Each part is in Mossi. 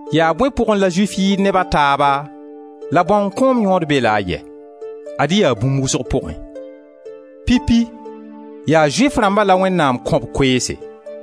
Yaa bõe pʋgẽ la Zʋɩf yɩɩd neb a taaba la bãong kõom yõod be-la a yɛ? Ad-y yaa bũmb wʋsg pʋgẽ. Pipi, yaa Zʋɩf rãmba la Wẽnnaam kõ b koeese.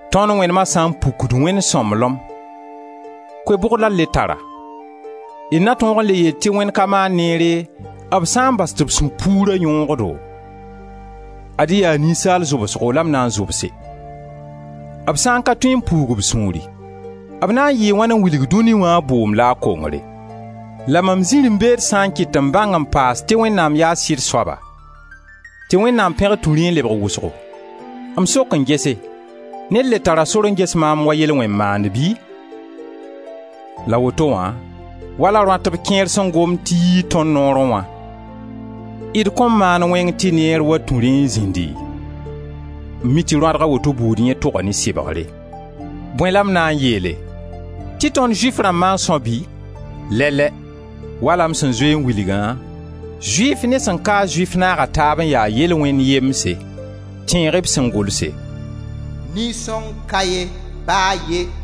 Tõnd wẽnema sã n pukd Wẽnd sõmblem, koe bʋg la d le tara? D na tõog n le yeel tɩ Wẽnd ka maan neere b sã n bas tɩ b sũ-puura yõog-do? Ad-y yaa ninsaal zʋbsgo la m na n zʋbse. B sã n ka tõe n puug b sũuri, b na n yɩɩ wãn n wilg dũni wã a bʋʋm la a kongre? La mam zirẽ-beed sã n kɩt tɩ m bãng n paase tɩ Wẽnnaam yaa sɩd soaba, tɩ Wẽnnaam pẽgr tũ rẽ n lebg wʋsgo, m sok n gese ned le tara sor n ges maam wa yel-wẽn-maand bɩ? La woto wã, wala rõatb kẽer sẽn gomd tɩ yii tõnd noorẽ wã, d kõn maan wẽng tɩ neer wa tũ rẽ n zĩndi? M mi tɩ rõadg a woto buud yẽ toga ne sɩbgre! Bõe la m na n yeele, tɩ tond Zʋɩf rãmbã n são bɩ? Lɛ-lɛ! Wala m sẽn zoe n wilgã, Zʋɩf ne sẽn ka-a Zʋɩf naaga taab n ya yel-wẽnd yemse. Tẽeg-y b sẽn gʋlse: «Nin-sõng ka ye, ba a ye.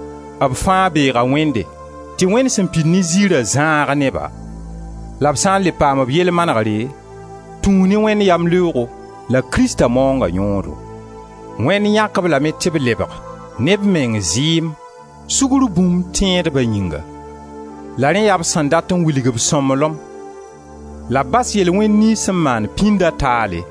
b fãa beega Wẽnde tɩ Wẽnd sẽn pid ne ziira zãag ne-ba. La b sã n le paam b yell manegre tũu ne Wẽnd yamleoog la Krista maoonga yõodo. Wẽnd yãk-b lame tɩ b lebg, ne b meng zɩɩm, sugr bũmb, tẽedba yĩnga; la rẽ yaa b sẽn dat n wilg b sõmblem la b bas yel-wẽn niyns sẽn maan pĩnda taale,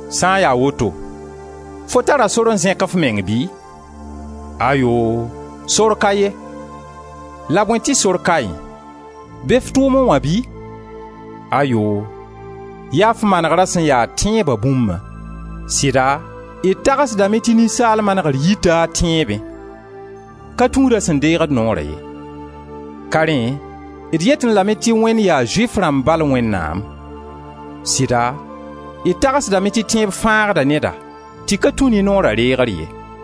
Sã n ya woto, fo tara sor n zẽk f meng bɩ? Ayoo, sor ka ye! La bõe tɩ sor kaẽ? Be f tʋʋmẽ wã bɩ? Ayoo! Yaa f manegrã sẽn ya tẽeba bũmbã. Sɩda d tagsdame tɩ ninsaal manegr yita a tẽebẽ. Ka tũud a sẽn deegd noora ye. Ka rẽ d yetẽ lame tɩ Wẽnd yaa Zʋɩf rãmb bal Wẽnnaam. Sɩda, d tagsdame tɩ tẽeb fãagda neda tɩ ka tũ ne Noora reegr ye.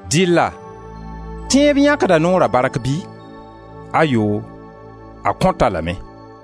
Dɩlla tẽeb yãkda Noora bark bɩ? Ayoo! A kõt-a lame.